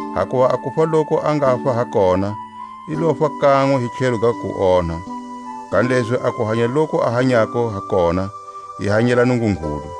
Hakuva a kufa loku a ngafa ha kona, i lofa kanwe hi tlhelo ga kuonha; kanilezi a kuhanya loku a hanyako ha kona, i hanyela Nungungulu.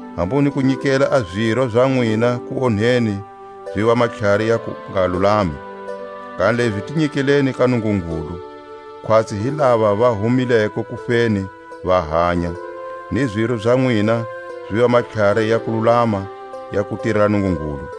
Hambu ni ku nyikela a ziro za nwina kuonheni ziva matlhari ya kungalulami; kanilezi ti nyikeleni ka Nungungulu, khwatsi hi lava va humileko kufeni va hanya, ni ziro za nwina ziva matlhari ya kululama ya ku tirela Nungungulu.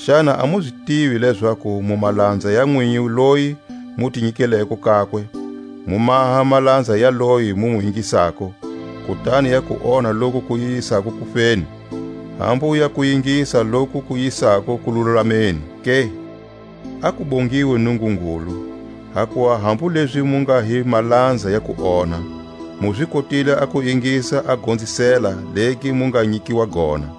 Xana a mu zi tivi lezaku mu malanza ya nwinyi loyi mu ti nyikelako kakwe, mu maha malanza ya loyi mu mu ingisako, kutani ya kuonha loku ku yisako kufeni, hambu ya kuingisa loku ku yisako kululameni ke? A ku bongiwe Nungungulu, hakuva hambu lezi mu nga hi malanza ya kuonha, mu zi kotile a ku ingisa a gonzisela legi mu nga nyikiwa gona.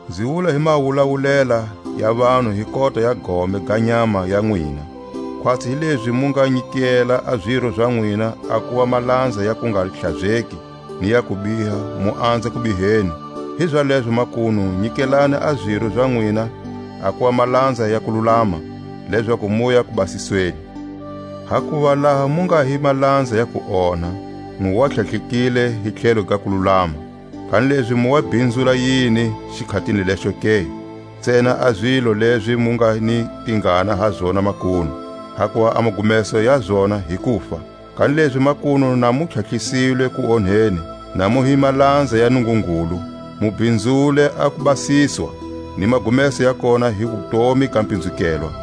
Nzi wula hi mawulawulela ya vanhu hi kota ya gome ga nyama ya nwina. Khwatsi hi lezi mu nga nyikela a ziro za nwina a kuva malanza ya kungahlazeki ni ya kubiha mu anza kubiheni, hizalezo makunu nyikelani a ziro za nwina a kuva malanza ya kululama lezaku muya kubasisweni. Hakuva laha mu nga hi malanza ya kuonha, mu wa tlhatlhekile hi tlhelo ga kululama. Kanilezi mu wa bhinzula yini xikhatini lexo ke? Ntsena a zilo lezi mu nga ni tingana ha zona makunu! hakuva a magumeso ya zona hi kufa. Kanilezi makunu na mu tlhatlhisilwe kuonheni, na mu hi malanza ya Nungungulu, mu bhinzule a kubasiswa, ni magumeso ya kona hi wutomi ga pinzukelwa.